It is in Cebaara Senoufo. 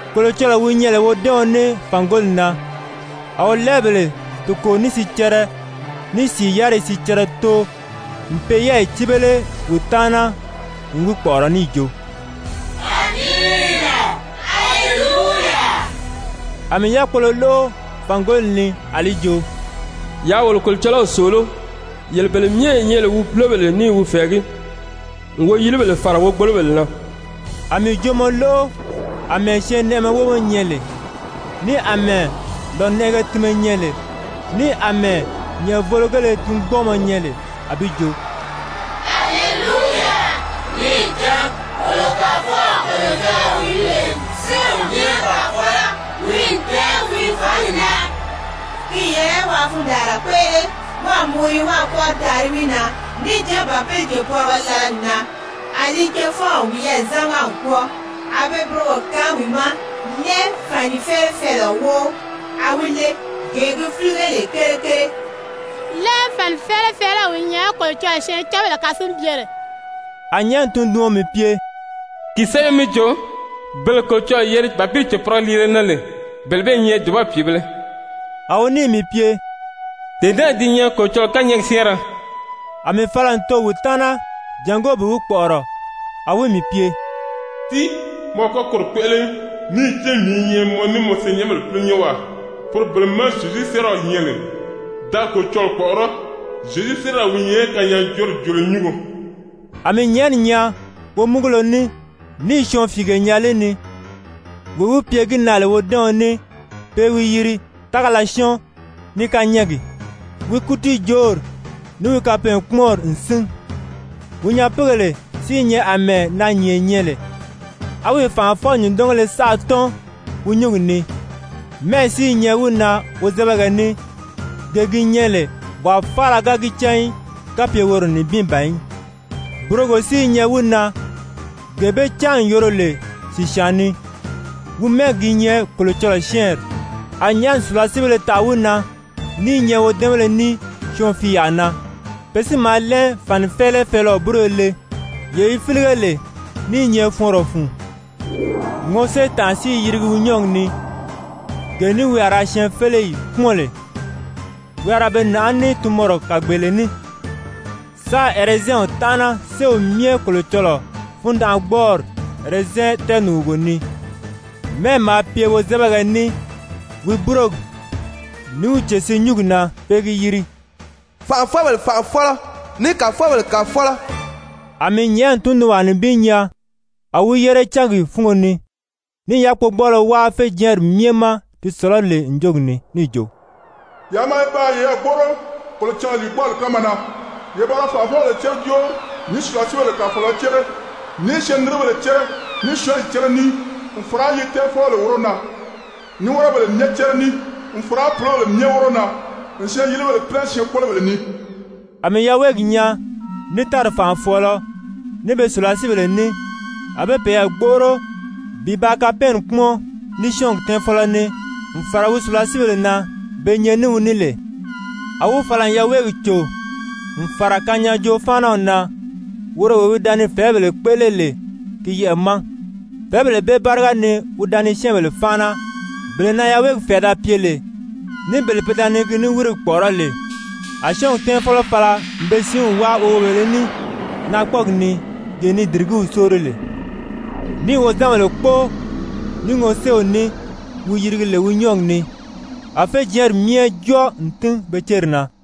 Kolocɔlɔɔ wi nyɛ lè wodɛ́ɛɔn ní fàngoli na, a wolɛɛbèle toko ní sicɛrɛ, ní sìi yáriyi sicɛrɛ too n pe yɛ́ɛyi cíbele wi taana n wi kpɔ̀ʔɔrɔ níì jo: «Amiina! Aleluya!» A mii yákpolo lóʔo fàngoli ni a li jo: «Yaa wolo Kolocɔlɔw sòoló, yele bele myɛ ye nyɛ lè wi púlobèle ní i wi fɛ̀ɛgí, n woyilibèle fàra wogbolobèle na!» A mii joomɔ lóʔo àmɛɛ syɛɛnnɛʔɛmɛ wómɔ nyɛ lè, ní àmɛɛ lònɛʔɛgɛ tinmɛ nyɛ lè, ní àmɛɛ nyɛ̀ʔɛvōlogèle tingbɔɔmɔ nyɛ lè, a bi jo: «Aleluya! Níì cán wolo Kàfɔw Kolocɔlɔɔ wi lè Séew Myɛ Kàfɔlɔ, wi n tɛ́ɛn wi fǎngi na. Ki n yɛlɛ waa fundaanra kpéʔele, wáā muguri, wáā kpɔ́ʔɔri taari wi na, níì cán Bàpili cèpɔrigɔ lala n nan, a li cefɔnw wiyɛɛ zámaga n kwɔ́ɔ. A be burogo kaan wi ma, lɛn fànifɛɛlɛfɛɛlɛɔ wóʔo, a wi le, gee gi fílige lè kere kere.» Lɛn fànifɛɛlɛfɛɛlɛw wi nyɛ Kolocɔlɔɔ syɛɛncanbèle kasinbyere. A nyɛ̀ʔɛni tunduɔn mii pye: «Ki sɛ́bɛ mi jo: ‹Bele Kolocɔlɔɔ yeri Bàpili cèpɔrigɔ liile na lè, bele bee i nyɛ dùba pìibēle!›» A wi níì mii pye: «Dee naa di nyɛ Kolocɔlɔɔ kányɛɛgi syɛ́ɛnrɛ.» A mii fala n too wi taana jàngó bi wi kpɔ̀ʔɔrɔ, a wi mii pye: «Tíi, mɔ a kɔ́ koro kpéʔele í! Níì cán mii i nyɛ mɔ ní mɔ senyɛnbèle púlonyɛnwaa, poro bele má Zyezu séeraw nyɛ lè. Da Kolocɔlɔɔ kpɔ̀ʔɔrɔ́! Zyezu séeraw wi nyɛ kanyaajoori joolo nyúngo.» A mii nyɛ̀ʔɛni nyaa womúgulo ní, níì syɔɔnfiige nyaa li ni. Wee wi pye gi na lè wodɛ́ɛɔn ní, pe i wi yiri Tágala Syɔ́ɔn ní Kányɛɛgi, wi kútiijoori ní wi kapɛɛnkpumɔnri n sín. Wi nyapiigèle si i nyɛ àmɛɛ naanyìnge nyɛ lè, á wi fànʔafɔ-nyùndɔngéle saʔa tɔ́n wi nyúngi ni. Mɛ́ʔɛ si i nyɛ wi na wozɛbɛgɛ ní, gee gi nyɛ lè wàa faala ga gi cán í, kapye woro nibin ban í, burogo si i nyɛ wi na, gee be cáan n yoro lè sìsyaan ni. Wi mɛ́ɛgi gi nyɛ Kolocɔlɔɔ Syɛ́ɛnri. A nyɛ̀ʔɛni sùlasiibéle taʔa wi na ní i nyɛ wodɛ́ɛnbéle ní syɔɔnfiiyaa na. Pe si maa lɛn fànifɛɛlɛfɛɛlɛɔ búroyo le, yee yi fílige lè ní i nyɛ fɔɔnrɔ fun. Ŋɔséetànʔa si i yirigi wi nyɔ́ɔgi ni, gee ní wi a ra syɛɛnfeleyi kpúmɔn lè. Wi a ra be nàʔá ní tunmɔrɔ kàgbeele ní, sáā ɛrɛzɛnw tánʔana Séew Myɛ Kolocɔlɔɔ fundanʔagbɔɔri ɛrɛzɛn tɛɛnùgugo ni. Mɛ́ʔɛ maa pye wozɛbɛgɛ ní wi búrogi, ní wi cèsiinyungi na, pe i gi yiri: FANʔAFƆBELE FANʔAFƆLƆ, ní KAFƆBELE KAFƆLƆ. A mii nyɛ̀ʔɛni tundunwaa nibin nyaa a wi yére cángi fúngo ni, ní i yákpogbɔɔlɔ wáa féjɛɛnri myɛ ma di sɔ̀lɔ́ lè ǹjogi ni níì jo: «Yaa maa ye ba yeyɛɛ gbóʔoro Kolocɔlɔɔ lìigbɔɔli kánma na, ye ba ra fànʔafɔbèle cére jóori, ní sùlasiibèle kàfɔɔlɔ cére, ní syɛɛnniribèle cére, ní syɔ́ɔnyi cére ní, n fàra yi tɛ́ɛnfɔbèle wóro na, ní wɔ́rɔbèle myɛ cére ní, n fàra púlobèle myɛ wóro na, n syɛɛn-yilibèle pínɛ syɛɛnkpolobèle ni.» A mii yaweegi nyaa, ní tári fànʔafɔɔlɔ, ní be sùlasiibèle ní, a be peyɛɛ gbóʔoro bi ba kapɛɛnni kpúmɔn ní syɔ́ɔngi tɛ́ɛnfɔlɔ ní, n fàra wi sùlasiibèle na be nyɛ ní wi ní lè. A wi fala n yaweegi cò n fàra kanyaajoo-fáanaw na, woro wee wi da ni fɛ̀ɛ́bèle kpéʔele lè ki yɛʔɛ̀ ma, fɛ̀ɛ́bèle bele báriga ni wi da ni syɛ́ɛnbèle fáana, bele na yaweegi fɛ̀ɛ da pye lè, ní bele pe da ni ki niwirigi kpɔ̀ʔɔrɔ́ lè. A syɔ́ɔngi tɛ́ɛnfɔlɔ fala n be siinw wáa woweebèlē ní naakpɔɔgi ni gee ni dìrigíw sóori lè, níì wozanbèle kpóo ní ŋɔséew ní wi yirigi lè wi nyɔ́ɔgi ni, a féjɛɛnri myɛ jɔ́ɔ n tín be céri na.